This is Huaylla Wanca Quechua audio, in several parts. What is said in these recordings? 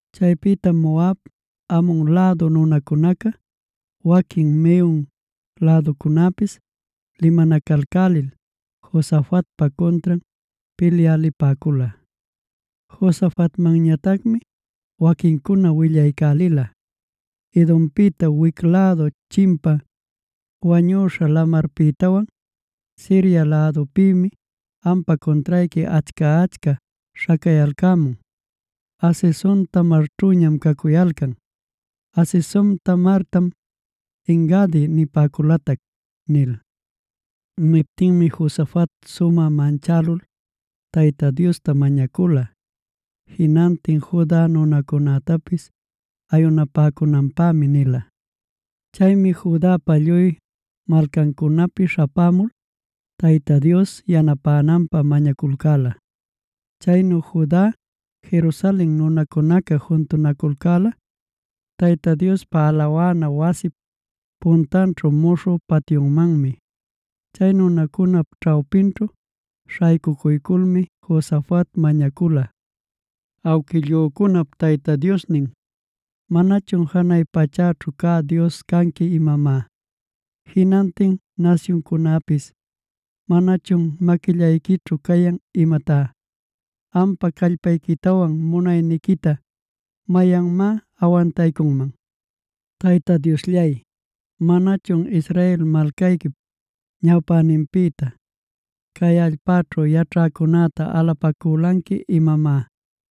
Chaypïtam Moab, Amon lädu nunacunaca waquin Meun läducunäpis limanacalcälil Josafatpa cuntran pilyä lipäcula. Josafatmanñatacmi waquincuna willaycälila: “Edompïta wic lädu chimpa Wañüśha Lamarpïtawan Siria lädupïmi ampa cuntrayqui achca-achca śhacayalcämun. Hazezon-tamarćhüñam cacuyalcan. (Hazezon-tamartam En-gadi nipäculatac)” nil. Niptinmi Josafat sumä manchälul Tayta Diosta mañacula; jinantin Juda nunacunätapis ayunapäcunanpämi nila. Chaymi Judapa lluy malcancunapi śhapämul Tayta Dios yanapänanpä mañaculcäla. Chaynu Juda, Jerusalen nunacunaca juntunaculcäla Tayta Diospa alawana wasip puntanćhu muśhü patyumanmi. Chay nunacunap ćhawpinćhu śhaycucuyculmi Josafat mañacula: “Awquillücunap Tayta Diosnin, ¿manachun janay pachäćhu cä Dios canqui imamá? ¿Jinantin nasyuncunäpis manachun maquillayquićhu cayan imatá? ¿Ampa callpayquitawan munayniquita mayanmá awantaycunman? Tayta Diosllay, ¿manachun Israel malcayquip ñawpäninpïta cay allpaćhu yaćhäcunäta alapacülanqui imamá?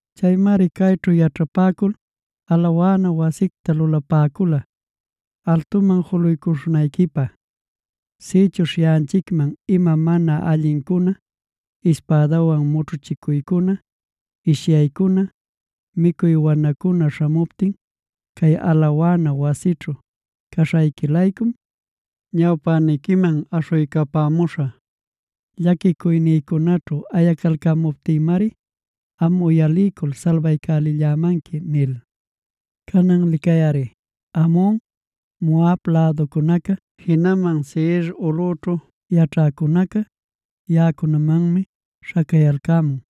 Chaymari cayćhu yaćhapäcul alawana wasicta lulapäcula altuman juluycuśhunayquipä: ‘Sïchuśh yaꞌanchicman ima mana allincuna, ispädawan mućhuchicuycuna, ishyaycuna, micuy wanacuna śhamuptin cay alawana wasićhu caśhayqui-laycum, ñawpäniquiman aśhuycapämuśhä. Llaquicuynïcunaćhu ayacalcämuptïmari am uyaliycul salbaycälimanqui’ nil. “Canan licayꞌari, Amon, Moab läducunaca jinaman Seir ulꞌućhu yaćhäcunaca yaꞌacunamanmi śhacayalcämun.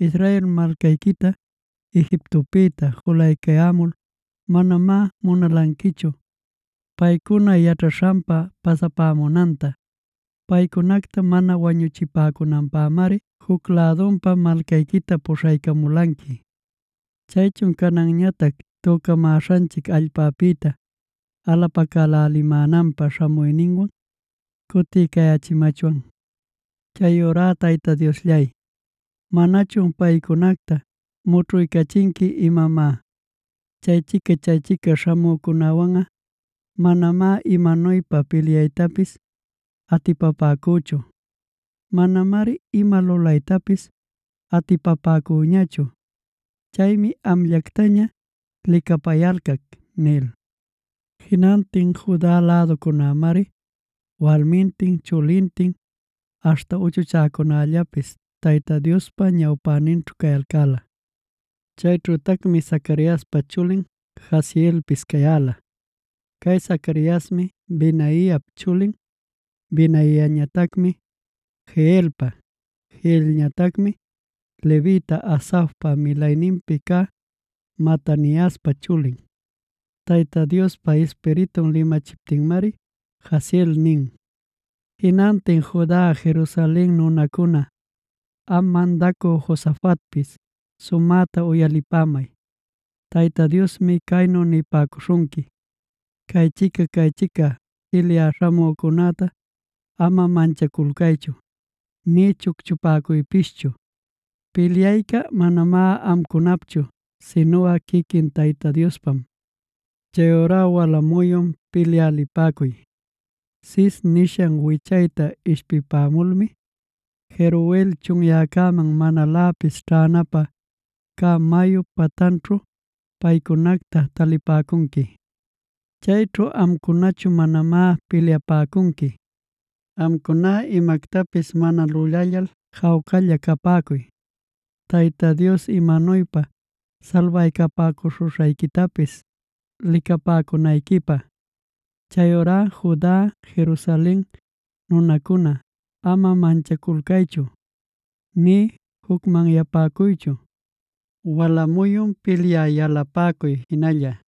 Israel malcayquita Egiptopïta julaycayämulb manamá munalanquichu, paycuna yaćhaśhanpa pasapämunanta. Paycunacta mana wañuchipäcunanpämari juc lädunpa malcayquita puśhaycamulanqui. Chaychun cananñatac tücamäśhanchic allpapïta alapacälälimänanpä śhamuyninwan cutiycayächimachwan. Chayurá Tayta Diosllay, ¿manachun paycunacta mućhuycachinqui imamá? Chaychica-chaychica śhamücunawanꞌa manamá imanuypa pilyaytapis atipapäcüchu. Manamari ima lulaytapis atipapäcüñachu. Chaymi amllactaña licapayalcac” nil. Jinantin Juda läducunämari walmintin chulintin aśhta uchuchäcunällapis Tayta Diospa ñawpäninćhu cayalcäla. Chayćhütacmi Zacariaspa chulin Jahazielpis cayäla. Cay Zacariasmi Benaiap chulin, Benaiañatacmi Jeielpa, Jeielñatacmi levita Asafpa milayninpi cä Mataniaspa chulin. Tayta Diospa Ispiritun limachiptinmari Jahaziel nin: “Jinantin Juda, Jerusalen nunacuna, am mandacü Josafatpis sumäta uyalipämay. Tayta Diosmi caynu nipäcuśhunqui: ‘Caychica-caychica pilyä śhamücunäta ama manchaculcaychu nï chucchupäcuypischu. Pilyayca manamá amcunapchu sinuꞌa quiquin Tayta Diospam. Chayurá wala muyun pilyä lipäcuy. Sis nishan wichayta ishpipämulmi Jeruel chunyäcäman manaläpis ćhänapä cä mayup patanćhu paycunacta talipäcunqui. Chayćhu amcunachu manamá pilyapäcunqui. Amcuná imactapis mana lulallal jawcalla capäcuy Tayta Dios imanuypa salbapäcuśhuśhayquitapis licapäcunayquipä. Chayurá Juda, Jerusalen nunacuna ama manchaculcaychu nï jucmanyapäcuychu. Wala muyun pilyä yalapäcuy jinalla;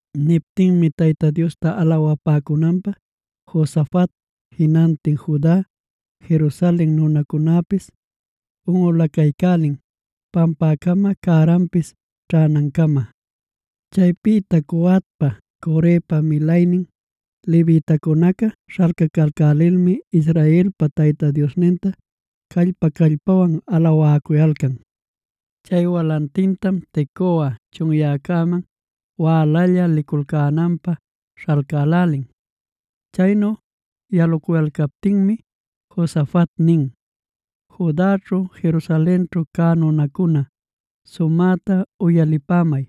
Niptinmi Tayta Diosta alawapäcunanpä Josafat, jinantin Juda, Jerusalen nunacunäpis unꞌulacaycälin pampäcama cäranpis ćhänancama. Chaypïta Coatpa, Corepa milaynin levitacunaca śhalcacalcälilmi Israelpa Tayta Diosninta callpa-callpawan alawäcuyalcan. Chay walantintam Tecoa chunyäcaman wälalla liculcänanpä śhalcälälin. Chaynu yaluyalcaptinmi Josafat nin: “Judaćhu, Jerusalenćhu cä nunacuna sumäta uyalipämay: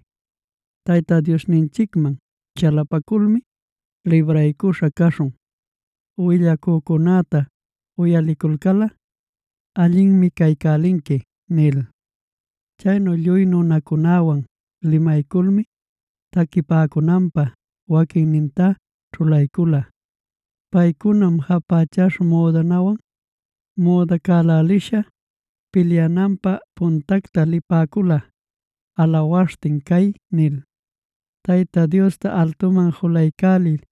Tayta Diosninchicman chalapaculmi libraycuśha caśhun. Willacücunäta uyaliculcalꞌa allinmi caycälinqui” nil. Chaynu lluy nunacunäwan limayculmi taquipäcunanpä waquinninta ćhulaycula. Paycunam japächäśha müdanawan müdacälälisha pilyäcunäpa puntanta lipäcula alawaśhtin cay nil: “Tayta Diosta altuman julaycäliy;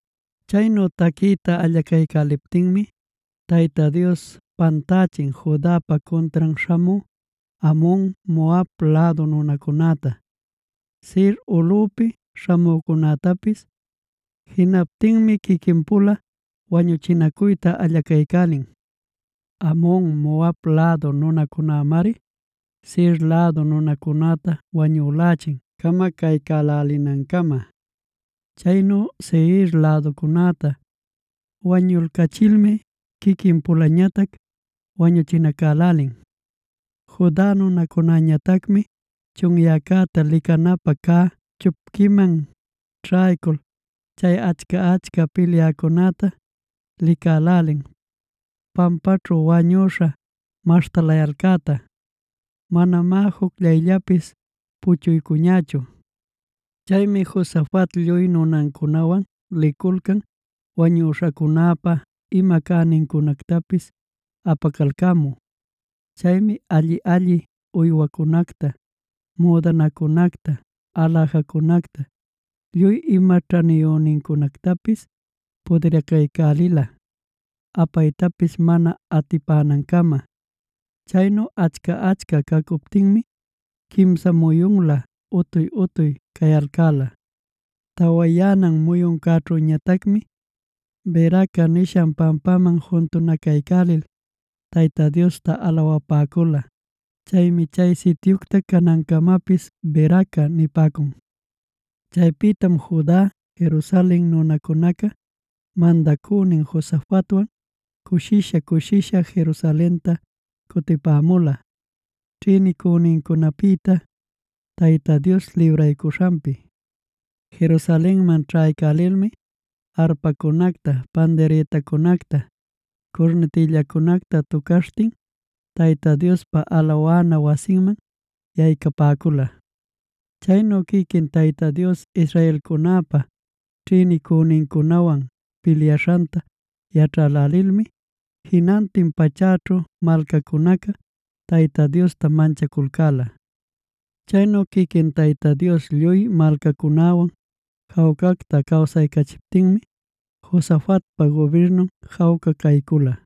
Chaynu taquiyta allacaycäliptinmi Tayta Dios pantächin Judapa cuntran śhamü Amon, Moab lädu nunacunäta, Seir ulꞌupi śhamücunätapis. Jinaptinmi quiquin-pula wañuchinacuyta allacaycälin. Amon Moab lädu nunacunämari Seir lädu nunacunäta wañülächin camacaycälälinancama. Chaynu Seir läducunäta wañulcälichilmi quiquin-pulañatac wañuchinacälälin. Juda nunacunäñatacmi chunyäcäta licanapä cä chupquiman ćhaycul chay achca-achca pilyäcunäta licälälin pampaćhu wañüśha maśhtalayalcäta. Manamá jucllayllapis puchuycuñächu. Chaymi Josafat lluy nunancunawan liculcan wañüśhacunäpa ima cänincunactapis apacalcämü. Chaymi alli-alli uywacunacta, müdanacunacta, aläjacunacta, lluy ima ćhaniyünincunactapis pudiracaycälila apaytapis mana atipänancama. Chaynu achca-achca cacuptinmi quimsa muyunlä utuy-utuy cayalcäla. Tawayänan muyuncäćhüñatacmi Beraca nishan pampaman juntunacaycälil Tayta Diosta alawapäcula. Chaymi chay sityucta canancamapis Beracae nipäcun. Chaypïtam Juda, Jerusalen nunacunaca mandacünin Josafatwan cushisha-cushisha Jerusalenta cutipämula ćhïnicünincunapïta Tayta Dios libraycuśhanpi. Jerusalenman ćhaycälilmi arpacunacta, pandirïtacunacta, curnitillacunacta tucaśhtin Tayta Diospa alawana wasinman yaycapäcula. Chaynu quiquin Tayta Dios israelcunäpa ćhïnicünincunawan pilyaśhanta yaćhälälilmi, jinantin pachäćhu malcacunaca Tayta Diosta manchaculcäla. Chaynu quiquin Tayta Dios lluy malcacunäwan jawcacta cawsaycachiptinmi Josafatpa gubirnun jawca caycula.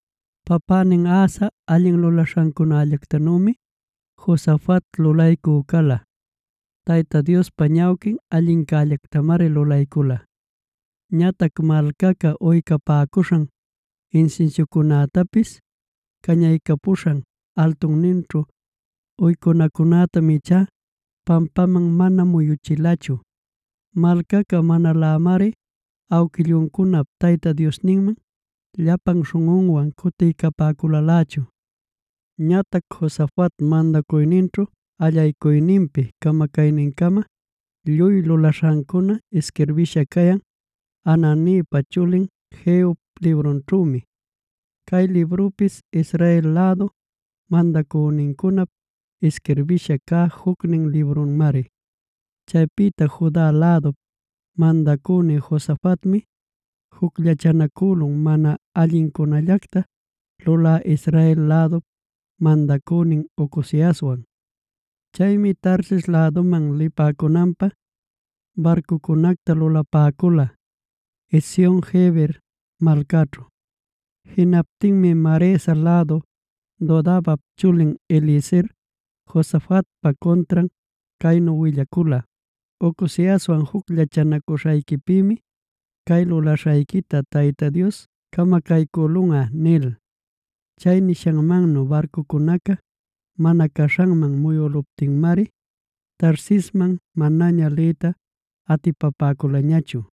Papänin Asa allin lulaśhancunallactanümi Josafat lulaycü cala. Tayta Diospa ñawquin allincällactamari lulaycula. Ñatac malcaca uycapäcuśhan, insinsiucunactapis cañaycapäcuśhan altunninćhu uycunacunätam ichá pampaman mana muyuchilachu. Malcaca manalämari awquilluncunap Tayta Diosninman llapan śhunꞌunwan cutiycapäculalächu. Ñatac Josafat mandacuyninćhu allaycuyninpi camacaynincama lluy lulaśhancuna isquirbïsha cayan Hananipa chulin Jehup librunćhümi. Cay librupis Israel lädu mandacünincunap isquirbisha cä jucnin librunmari. Chaypïta Juda lädup mandacünin Josafatmi jucllachanacülun mana allincunallacta lulä Israel lädup mandacünin Ocoziaswan. Chaymi Tarsis läduman lipäcunanpä barcucunacta lulapäcula, Ezion-geber malcaćhu. Jinaptinmi Maresa lädu Dodavap chulin Eliezer Josafatpa cuntran caynu willacula: “Ocoziaswan jucllachanacuśhayquipïmi cay lulaśhayquita Tayta Dios camacaycülunꞌa” nil. Chay nishanmannu barcucunaca mana caśhanman muyüluptinmari Tarsisman manaña liyta atipapäculañachu.